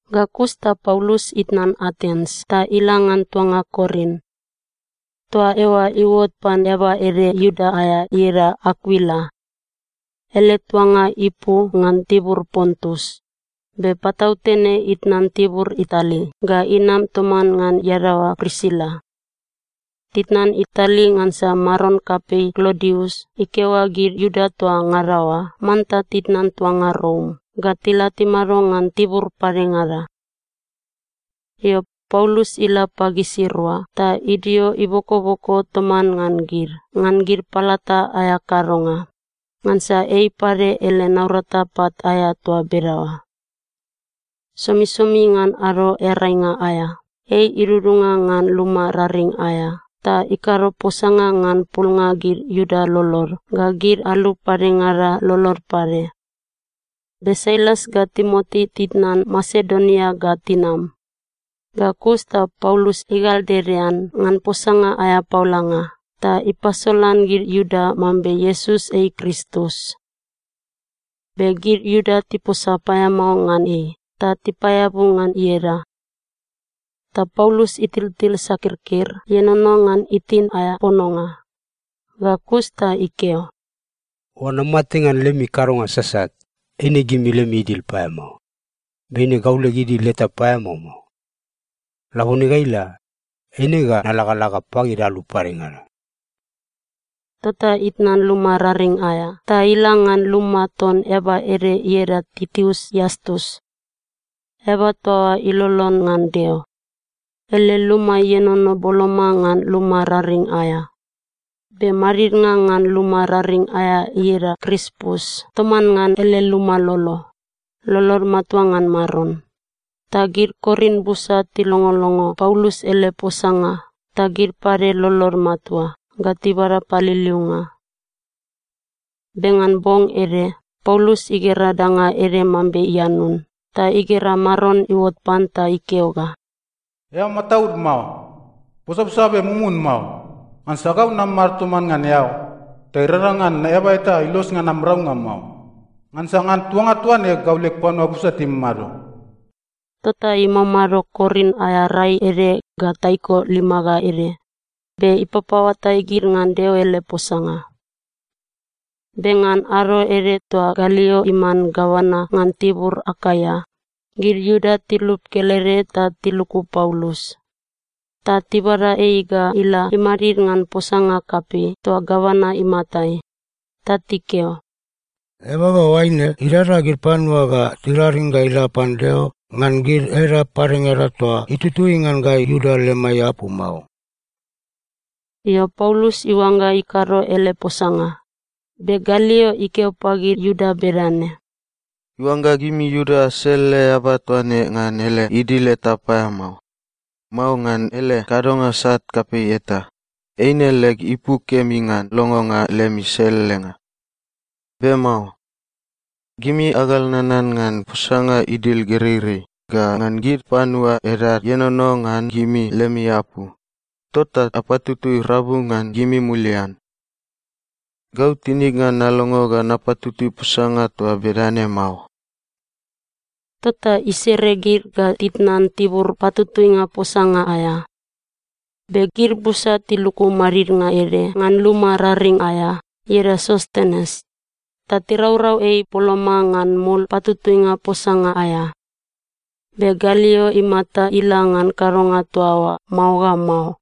Ga kus ta Paulus itnan Atens ta ila ngan tuanga Korin. Toa eoa iuot pan eaba ede Iuda aea ieda Akuila. Ele tuanga ipu ngan tibur Pontus, be patautene itnan tibur Itali ga inam toman ngan iadaoa Prisila. Titnan Itali ngansa maron kapei Klodius ikeo ga gid Iuda toa ngada oa manta titnan tuanga Rom ga tila timado ngan tibur padengada. Io, Paulus ila pagisirua ta idio ibokoboko toman ngan gid ngan gid palata aea kadonga, ngansa ei pade ele naurata pat aea toa bedaoa. Somisomi ngan Ado Earainga aea, ei idudunga ngan luma raring aea ta ikado posanga ngan pulnga gid Iuda lolod ga gid alu padengada lolod pade. Be Sailas ga Timoti titnan Masedonia ga tinam ga kus ta Paulus igaldedean ngan posanga aea paolanga ta ipasolan gid Iuda mambe Iesus ei Kristus. Be gid Iuda tiposa paeamao ngan ei ta tipaeabu ngan ieda. Ta Paulus itiltil sakirkir ienono ngan itin aea pononga. Ga kus ta ikeo, “Oangga amate ngan lemi kadonga sasat, eine gimi lemi idil paeamao. Be eine gau leg idil eta paeamao mao. Labone ga ila, eine ga nalagalaga pagid alu padengada.” Tota itnan luma raring aea ta ila ngan luma ton eaba ede ieda Titius Iastus. Eaba toa oa ilolon ngan Deo. Ele luma ienono boloma ngan luma raring aea. Be madidnga ngan luma raring aea ieda Krispus toman ngan ele luma lolo, lolod matua ngan Maron. Ta gid Korin busa tilongolongo Paulus ele posanga ta gid pade lolod matua ga tibada paliliunga. Be ngan bong ede Paulus igera danga ede mambe ianun ta igera Maron iuot pan ta ikeo ga, “Eao mataud mao. Posaposa be mumun mao. Ngansa gau namamado toman ngan eao, ta irangrang ngan eaba eta ilos ngan am raunga mao, ngansa ngan tuanga toa ne gau leg panua busa timamado.” Tota imamado Korin aea rai ede ga taiko lima ga ede be ipapaoatai gid ngan Deo ele posanga. Be ngan ado ede toa Galio iman gavana ngan tibur Akaia, gid Iuda tilup kelede ta tiluku Paulus. Ta tibada ei ga ila imadid ngan posanga kapei toa gavana imatai. Ta tikeo, “Eaba ga oaine idada gid panua ta tiraring ga ila pan Deo ngan gid edap padengada toa itutui ngan gai Iuda lemai apu mao!” Io, Paulus iuangga ikado ele posanga, be Galio ikeo pagid Iuda bedane, “Oangga gimi Iuda aselele eaba toa ne ngan ele idil eta paeamao, mao ngan ele kadonga sat kapei eta, eine leg ipu kemi ngan longonga lemi selelenga. Be mao. Gimi agal nanan ngan posanga idil gereirei ga ngan gid panua edad ienono ngan gimi lemi apu, tota apatutui rabu ngan gimi mulian. Gau tinig ngan nalongo ga napatutui posanga toa bedane mao.” Tota isere gid ga titnan tibur patutuinga posanga aea. Be gid busa tiluku madidnga ede ngan luma raring aea ieda Sostenes ta tiraurau ei boloma ngan mul patutuinga posanga aea. Be Galio imata ila ngan kadonga toa oa mao ga mao.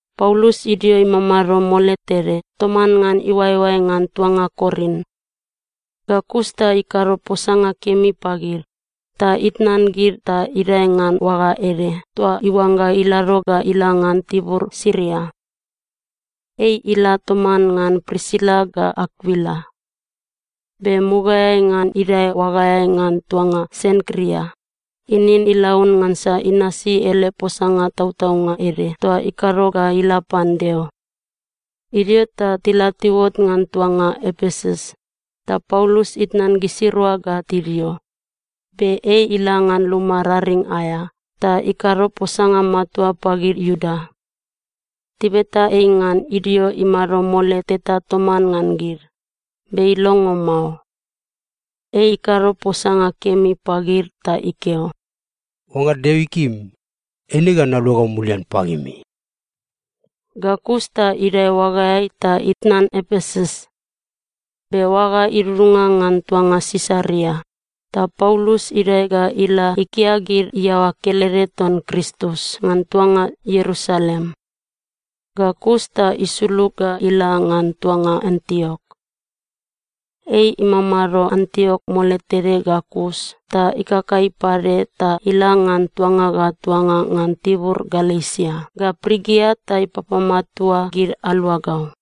Paulus idio imamado mole tede toman ngan iuaeoae ngan tuanga Korin. Ga kus ta ikado posanga kemi pagid ta itnan gid ta idae ngan oaga ede toa iuangga ilado ga ila ngan tibur Siria. Ei ila toman ngan Prisila ga Akuila. Be mugaeai ngan idae oagaeai ngan tuanga Senkria, inin ilaun ngansa inasi ele posanga tautaunga ede toa ikado ga ila pan Deo. Idio ta tila tiuot ngan tuanga Epesus, ta Paulus itnan gisirua ga tidio, be ei ila ngan luma raring aea ta ikado posanga matua pagid Iuda. Tibeta ei ngan idio imado mole teta toman ngan gid, be ilongo mao. Ei ikado posanga kemi pagid ta ikeo, “Oangga Deo ikim, eine ga naluagau mulian pagimi.” Ga kus ta idae oagaeai ta itnan Epesus. Be oaga idudunga ngan tuanga Sisaria, ta Paulus idae ga ila ikia gid iaoa kelede ton Kristus ngan tuanga Ierusalem. Ga kus ta isulug ga ila ngan tuanga Antiok. Ei imamado Antiok mole tede ga kus ta ikakai pade ta ila ngan tuanga ga tuanga ngan tibur Galesia ga Prigia ta ipapamatua gid aluagau.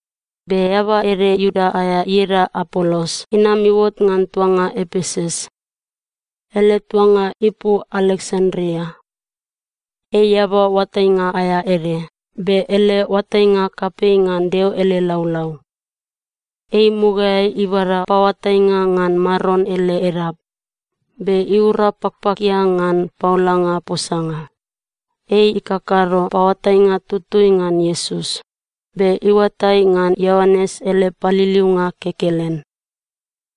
Be eaba ede Iuda aea ieda Apolos inam iuot ngan tuanga Epesus. Ele tuanga ipu Aleksandria. Ei eaba oatainga aea ede be ele oatainga kapei ngan Deo ele laulau. Ei mugaeai ibada paoatainga ngan Maron ele edap be iura pakpakia ngan paolanga posanga. Ei ikakado paoatainga tutui ngan Iesus, be iuatai ngan Ioanes ele paliliunga kekelen.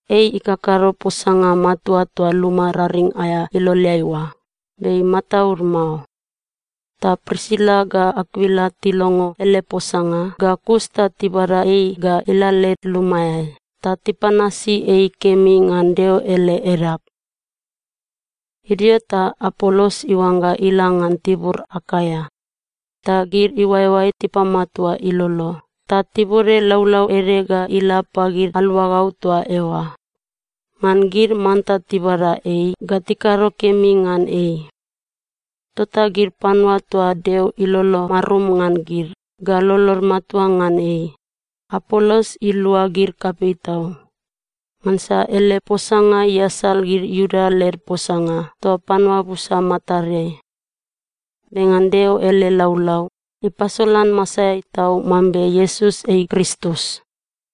Ei ikakado posanga matua toa luma raring aea iloleai oa be imataud mao. Ta Prisila ga Akuila tilongo ele posanga ga kus ta tibada ei ga ila led lumaeai ta tipanasi ei kemi ngan Deo ele edap. Idio ta Apolos iuangga ila ngan tibur Akaia, ta gid iuaeoae tipamatua ilolo ta tibode laulau ede ga ila pagid aluagau toa eoa ngan gid manta tibada ei ga tikado kemi ngan ei. Tota gid panua toa Deo ilolo marum ngan gid ga lolod matua ngan ei, Apolos ilua gid kapei tau. Ngansa ele posanga iasal gid Iuda led posanga toa panua busa matadeai. Be ngan Deo ele laulau, ipasolan masaeai tau mambe Iesus ei Kristus.